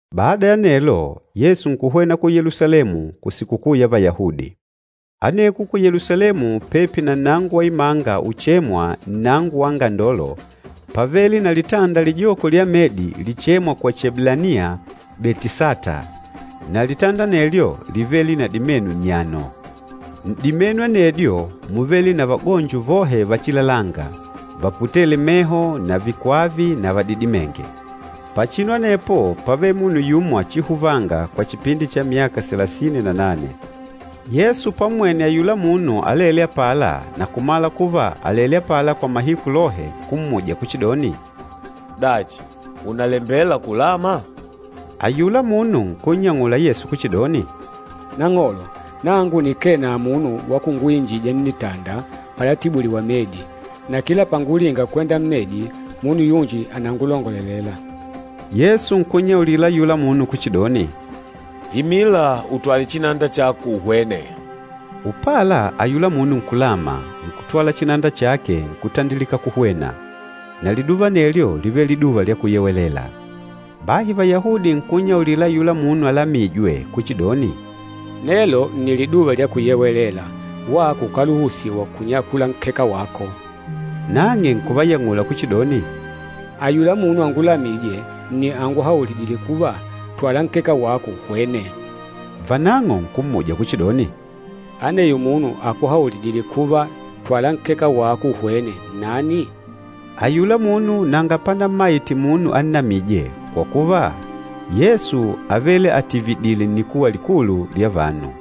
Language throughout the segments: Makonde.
Bada ya anelo, Yesu nkuhwena ku Yelusalemu kusikukuu ya Vayahudi. Aneko ku Yelusalemu, pepi na nnango wa imanga uchêmwa, “Nnango wa Angandolo,” pávele na litanda lijoko lya medi lichêmwa kwa Chieblaniya “Betisata,” na litanda anelyo lívele na dimenu nnyano. N'dimenu anedyo múvele na vagonjo vohe vachilalanga, vaputêle meho na vanji vikwava na vanji vadidimênge. Pachinu anepo pávele munu yumo achihuvanga kwa chipindi cha myaka salasini na nane. Yesu pammwene ayula munu alêle apala na kumala kuva àlele apala kwa mahiku lohe, nkummuja kuchidoni, “Dachi, ùnalembela kulama?” Ayula munu nkunnyang'ula Yesu kuchidoni, “Nang'olo, nangu nikee na munu wa kunguinjija nnitanda palatibuliwa medi. Na kila pangulinga kwenda mmedi, munu yunji ànangulongolelela.” Yesu nkunnyaulila ayula munu kuchidoni, “Imila, utwale chinanda chako, uhwene.” Upala ayula munu nkulama, nkutwala chinanda chake, nkutandilika kuhwena. Na liduva anelyo lívele Liduva lya Kuyewelela. Bahi Vayahudi nkunnyaulila ayula munu alamîjwe kuchidoni, “Nelo nni Liduva lya Kuyewelela, wako ukáluhusiwa kunyakula nkeka wako.” Nang'e nkuvayang'ula kuchidoni, “Ayula munu angulamîje nni anguhaulidîle kuva, ‘Twala nkeka wako uhwene.’” Vanang'o nkummuja kuchidoni, “Aneyo munu akuhaulidîle kuva, ‘Twala nkeka wako uhwene,’ nnani?” Ayula munu nanga pannammaite munu annamîje, kwa kuva, Yesu ávele atividììle nnikuwa likulu lya vanu.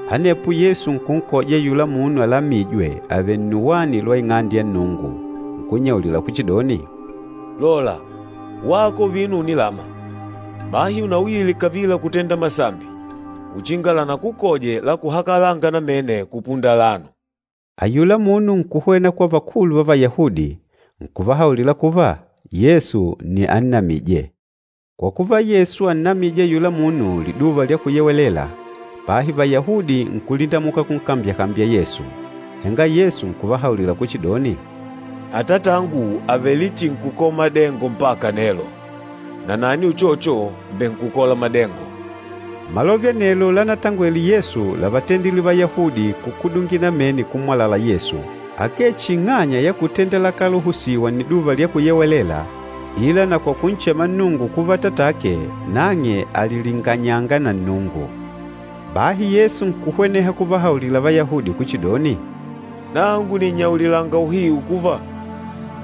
Anepo Yesu nkunkoja ayula munu alamîjwe avèlè nnuwani lwa Ing'ande ya Nnungu, nkunnyaulila kuchidoni, “Lola, wako vino ùnilama. Bahi unauyile kavila kutenda masambi, uchinga lanakukoje la kuhakalanga namene kupunda alano.” Ayula munu nkuhwena kwa vakulu va Vayahudi, nkuvahaulila kuva, Yesu nni annamîje. Kwa kuva, Yesu ánnamije ayula munu Liduva lya Kuyewelela, bahi Vayahudi nkulindamuka kunkambyakambya Yesu. Henga Yesu nkuvahaulila kuchidoni, “Atatangu àvele chihi nkukola madengo mpaka nelo, nanani uchocho mbènkukola madengo.” Malove anelo lanatangwele Yesu lavatendile Vayahudi kukudungila namene kummwalala Yesu, akee chihi ing'anya ya kutenda lakáluhusiwa Nniduva lya Kuyewelela, ila na kwa kunchema Nnungu kuva Atatake, nang'e àlilinganyanga na Nnungu. Bahi Yesu nkuhweneha kuvahaulila Vayahudi kuchidoni, “Nangu nìnnyaulilanga uhiu kuva,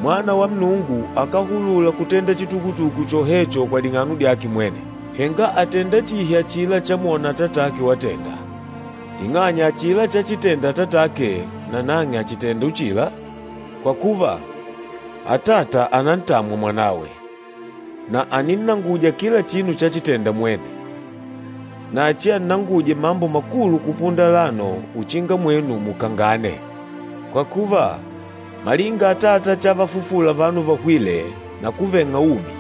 Mwana wa Nnungu akáhulula kutenda chitukutuku chohecho kwa ding'ano dyake mwene, henga àtenda chihi achila chamwona Atatake watenda. Ing'anya, achila chachitenda Atatake nanang'e àchitenda uchila. Kwa kuva, Atata ànantamwa Mwanawe, na àninnanguja kila chinu chachitênda mwene. Na achiannanguje mambo makulu kupunda alano uchinga mwenu mukangane. Kwa kuva, malinga Atata chavafufula vanu vahwîle na kuveng'a umi,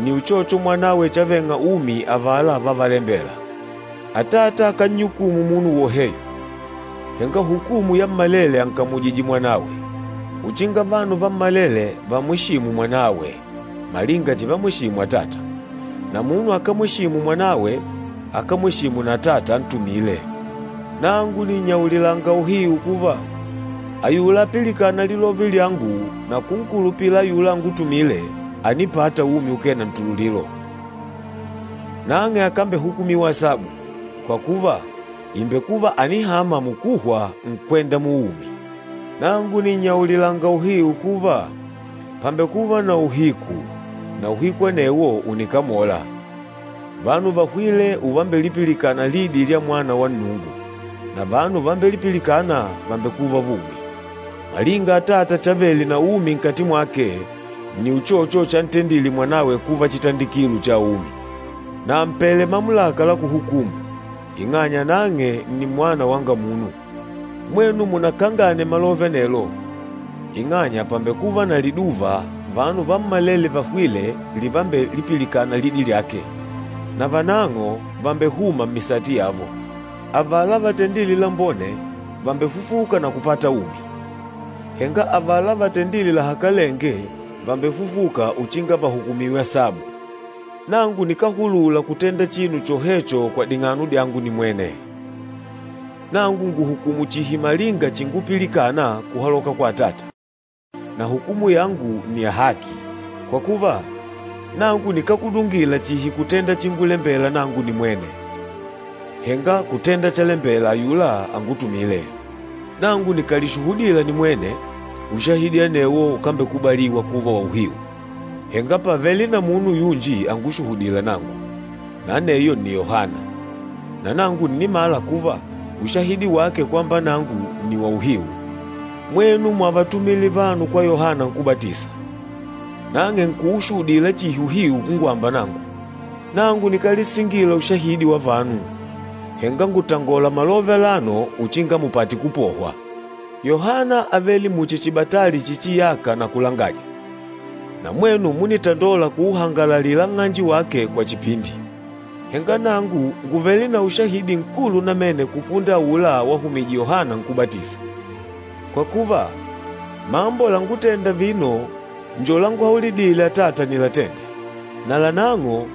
nni uchocho Mwanawe chaveng'a umi avala vávalembêla. Atata akánnyukumu munu woheyo, henga hukumu yammalele ànkamujije Mwanawe, uchinga vanu vammalele vamwesììmù Mwanawe, malinga chivamweshimu Atata. Na munu akámweshimu Mwanawe, akámweshimu na Atata antumîle. Nangu nìnnyaulilanga uhiu kuva, ayula apilikâna lilove lyangu na kunkulupila ayula angutumîle, ànipata umi ukee na ntululilo. Nang'e akambehukumiwa asabu, kwa kuva, ìmbekuva ànihama mukuhwa, nkwenda muumi. Nangu nìnnyaulilanga uhiu kuva, pàmbekuva na uhiku, na uhiku anewo ùnikamola, vanu vahwîle uvambelipilikana lidi lya Mwana wa Nnungu, na vanu vambelipilikâna, vàmbekuva vumi. Malinga Atata chavele na umi nkati mwake, nni uchocho chantendile Mwanawe kuva chitandikilo cha umi. Na àmpele mamulaka la kuhukumu, ing'anya nang'e nni Mwana wanga Munu. Mwenu munakangane malove anelo, ing'anya pàmbekuva na liduva, vanu vammalele vahwîle livambelipilikana lidi lyake, na vanang'o vàmbehuma mmisati yavo. Avala vatendîle lambone vàmbefufuka na kupata umi, henga avala vatendîle lahakalenge vàmbefufuka uchinga vahukumiwe asabu.” “Nangu nikáhulula kutenda chinu chohecho kwa ding'ano dyangu nimwene. Nangu ngùhukumu chihi malinga chingupilikana kuhaloka kwa Atata, na hukumu yangu ni ya haki, kwa kuva nangu nikákudungila chihi kutenda chingulembela nangu nimwene, henga kutenda chalembela ayula angutumîle. Nangu nikàlishuhudila nimwene, ushahidi anewo ukambekubaliwa kuva wa uhiu. Henga pàvele na munu yunji angushuhudîla nangu, na aneyo nni Yohana, na nangu nnìmala kuva ushahidi wake kwamba nangu ni wauhiu. Mwenu mwavatumile vanu kwa Yohana Nkúbatisa, nang'e nkuushuhudila chihi uhiu kungwamba nangu. Nangu nikálisingila ushahidi wa vanu, henga ngùtangola malove alano uchinga mupate kupohwa. Yohana ávele muchi chibatali chichiyaka na kulangaja, na mwenu múnitandola kuuhangalalila nng'anje wake kwa chipindi. Henga nangu ngùvele na ushahidi nkulu namene kupunda aula wahumije Yohana Nkúbatisa. Kwa kuva, mambo langútèndà vino njo lánguhaulidìlè Atata nilatende, nalanang'o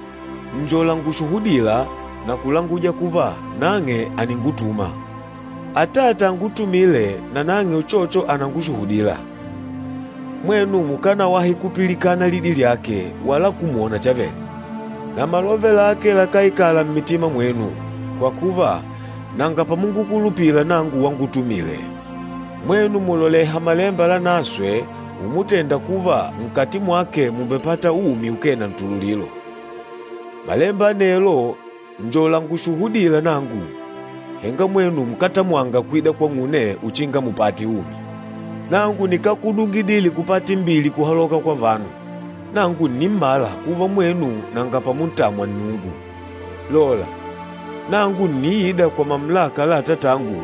nni langushuhudîla na kulanguja kuva nang'e àningutuma. Atata angutumîle nanang'e uchocho ànangushuhudila. Mwenu mukanawahi kupilikana lidi lyake wala kumwona chavele. Na malove lake lakáikala mmitima mwenu, kwa kuva nanga pamungukulupila nangu wangutumile. Mwenu mùloleha Malemba Lanaswe umutenda kuva nkati mwake mùmbepata umi ukee na ntululilo. Malemba anelo njo lángushuhudìlà nangu, henga mwenu nkátamwanga kwida kwang'une uchinga mupate umi. Nangu nikákudungidile kupata imbili kuhaloka kwa vanu. Nangu ǹnimmala kuva mwenu nanga pamuntamwa Nnungu. Lola! Nangu ǹniida kwa mamulaka la Atatangu,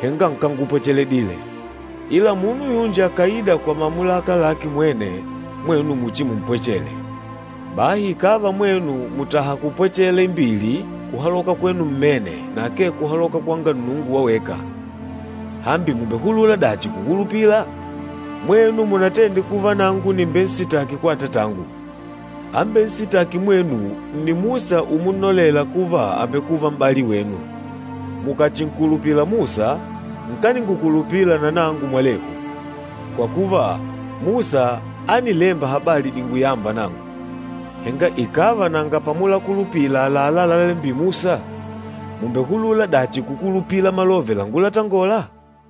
henga nkángupwecheledile, ila munu yunji akàida kwa mamulaka lake mwene, mwenu muchimumpwechele. Bahi ikàva mwenu mùtaha kupwechela imbili kuhaloka kwenu mmene na akee kuhaloka kwanga Nnungu wa weka, hambi mùmbehulula dachi kukulupila? Mwenu munatende kuva nangu nìmbensitaki kwa Atatangu. Ambensitâki mwenu nni Musa umunnolela kuva àmbekuva m'bali wenu. Mukàchinkulupila Musa, nkaningukulupila na nangu mwalehu, kwa kuva Musa ánilemba habali dinguyâmba nangu. Henga ikàva nanga pamulakulupila àlalá lalémbîle Musa, mùmbehulula dachi kukulupila malove lángutangòlà?”